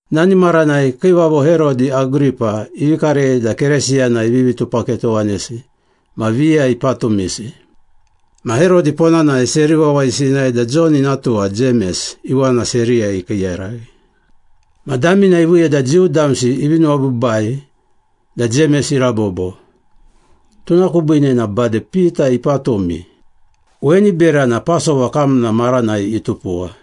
Nani maranai Kiivavo Herodi Agripa ivi karei da Keresiyana ivivi tupaketowanesi ma viya ipatumisi. Ma Herodi ponanai seri wawayisi inae da Jon ina tuwa Jemes iwana seriyai ikiiyaraghi. Ma damina iviiya da Jiu damsi ivi nuwabiibai da Jemes irabobo, tuna kubiine na bade Pita ipatumi. Weni berana Pasova kamna maranai itupuwa.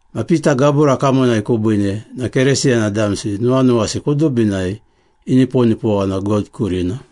Ma Pita gabura kamonai kubiine na Keresiyana damsi nuwanuwasi kudubinai iniponipowana God kurina.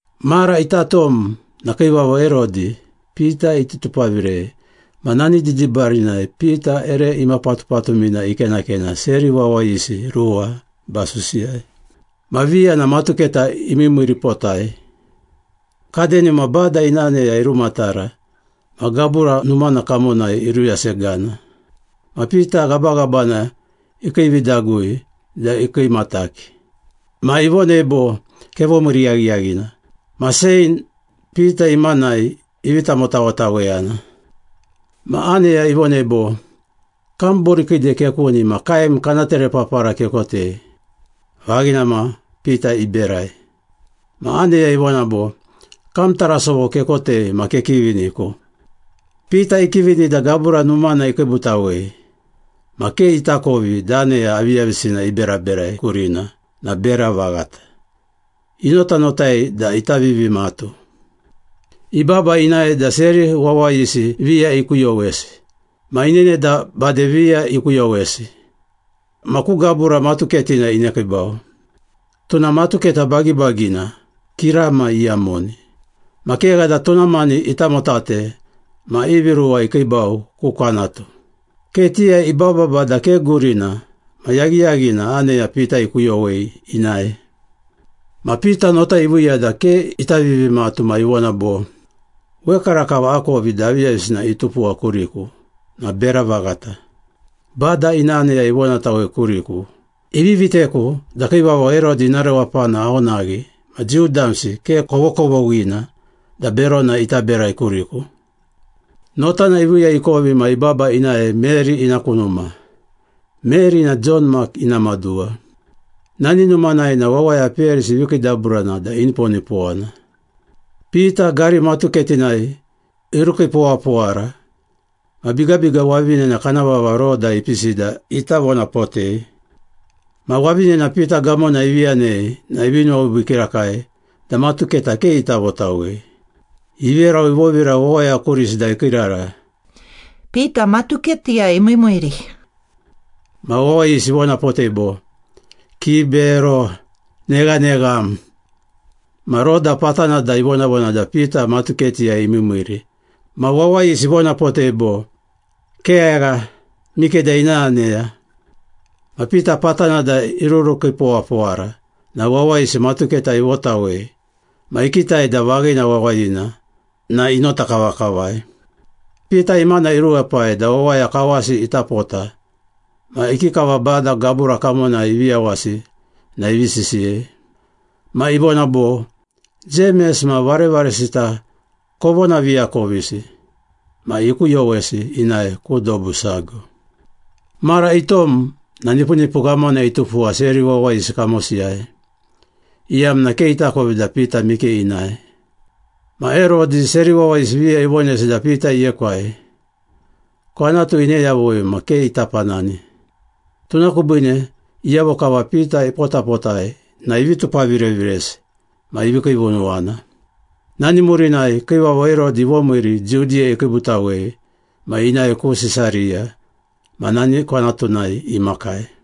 Mara ita tom na Kiivavo Herodi, Pita iti tupavirei ma nani didibarinai Pita ere imapatupatumina ikenakena seri wawayisi ruwa basusiyai. Ma viya na matuketa imiimiiripotai. Kadenima Bada ina aneya irumatara ma gabura numana kamonai iruyasegana. Ma Pita ghabaghabana ikiividagui da ikiimataki. Ma ivonei bo, “Kevomiiri yaghiyaghina!” Ma chein Pita imanai ivi tamotawetaweyana. Ma aneya ivonei bo, “Kam borikiide kekuni ma kaem kana terepapara kekotei.” Vaghina ma, Pita iberai. Ma aneya ivona bo, “Kam tarasovo kekotei ma kekiviniku.” Pita ikivini da gabura numana ikiibutawei, ma ke itakovi da aneya aviyavisina iberaberai kurina na bera vaghata, inotanotai da ita vivimatu. Ibaba inae da seri wawayisi viya ikuyowesi ma inene da bade viya ikuyowesi ma ku gabura matuketina inekiibau. Tuna matuketa bagibagina, kirama iyamoni. Ma kegha da tuna mani itamotate ma ivi ruwa ikiibau ku kwanatu. Ketiyai ibababa da ke gurina ma yaghiyaghina aneya Pita ikuyowei inae. Ma Pita nota iviiya da ke ita vivimatu ma ivona bo, “Wekarakava akovi da aviyavisina itupuwa kuriku na bera vaghata. Bada ina aneya ivonatawei kuriku, ivi viteku da Kiivavo Herodi ina rewapana aonaghi ma Jiu damsi ke kovokovoghina da berona ita berai kuriku.” Notana iviiya ikovi ma ibaba inae Meri ina ku numa. Meri na Jon Mak ina maduwa. Nani numanai na wawaya peyarisi ivi kiidaburana da iniponipowana. Pita gari matuketinai irukiipowapowara ma bigabiga wavinena kana vava Roda ipisi da ita vonapotei. Ma wavinena Pita gamona ivi yanei na ivi nuwabiibii kirakai da matuketa ke ita votawei. Iverau ivovira wawaya kurisi da ikiirara, “Pita matuketiyai emiimiiri!” Ma wawayisi ivonapotei bo, “Kibero! Neghanegham!” Ma Roda patana da ivonavona da Pita matuketiyai imiimiiri ma wawayisi ivonapotei bo, “Kegha, mikeda ina aneya.” Ma Pita patana da irurukiipowapowara na wawayisi matuketa ivotawei ma ikitai da vaghina wawayina na inota kavakavai. Pita imana iruepai da wawaya kawasi ita pota ma ikikava Bada gabura kamonai ivi yawasi na ivi sisiyei. Ma ivona bo, “Jemes ma varevaresita kovonaviakovisi.” Ma ikuyowesi inae ku dobu sago. Mara itom na nipunipu ghamana itupuwa seri wawayisi kamosiyai, iyamna ke itakovi da Pita mike inae. Ma Herodi seri wawayisi viya ivonesi da Pita iekwai, kwanatu ine yavui ma ke ita panani. Tuna kubiine iyavo kava Pita ipotapotai na ivi tupavireviresi ma ivi kiivunuwana. Nani murinai Kiivavo Herodi ivomiiri Judiya ikiibutawei ma inae ku Sisariya ma nani kwanatunai imakai.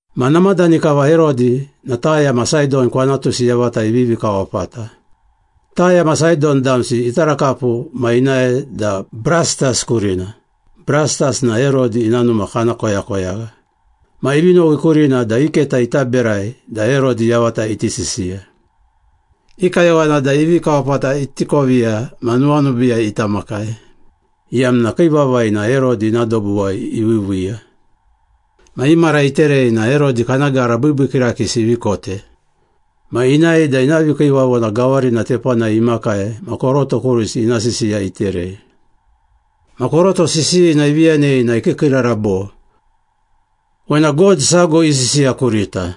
Ma namadani kava Herodi na Taya ma Saidon kwanatusi yavata ivivi kawapata. Taya ma Saidon damsi itarakapu ma inae da Brastas kurina, Brastas na Herodi ina numa kana koyakoyagha. Ma ivi nowi kurina da i keta ita berai da Herodi yavata iti sisiya. I kayowana da i vikawapata iti koviya ma nuwanubiiyai ita makai, iyamna kii vavai na Herodi ina dobuwai iviiviiya. Ma i mara iterei na Herodi kana gara biibii kirakiisi ivi kote. Ma inae da ina vikiivavona gawarina tepanai imakai ma koroto kurisi ina sisiya iterei. Ma koroto sisiyina ivi yanei na ikiikiirara bo, “Wena god sago isisiya kurita,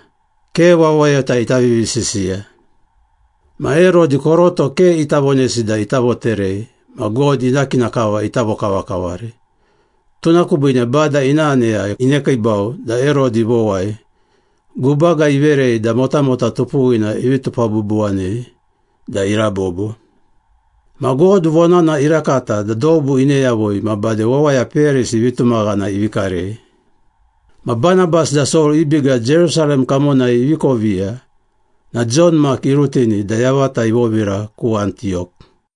ke wawayota ita vivisisiya.” Ma Herodi koroto ke ita vonesi da ita voterei ma God ina kina kava ita vokavakavari, tuna kubiine Bada ina aneya inekiibau da Herodi ivowai, gubaga iverei da motamota tupuwina ivi tupabubuwanei da irabobo. Ma God vonana irakata da dobu ine yavui da bade wawaya peyarisi vitumaghana ivi karei. Ma Banabas da Sol i biga Jerusalem kamonai ivi koviya na Jon Mak irutini da yavata ivovira ku Antiyok.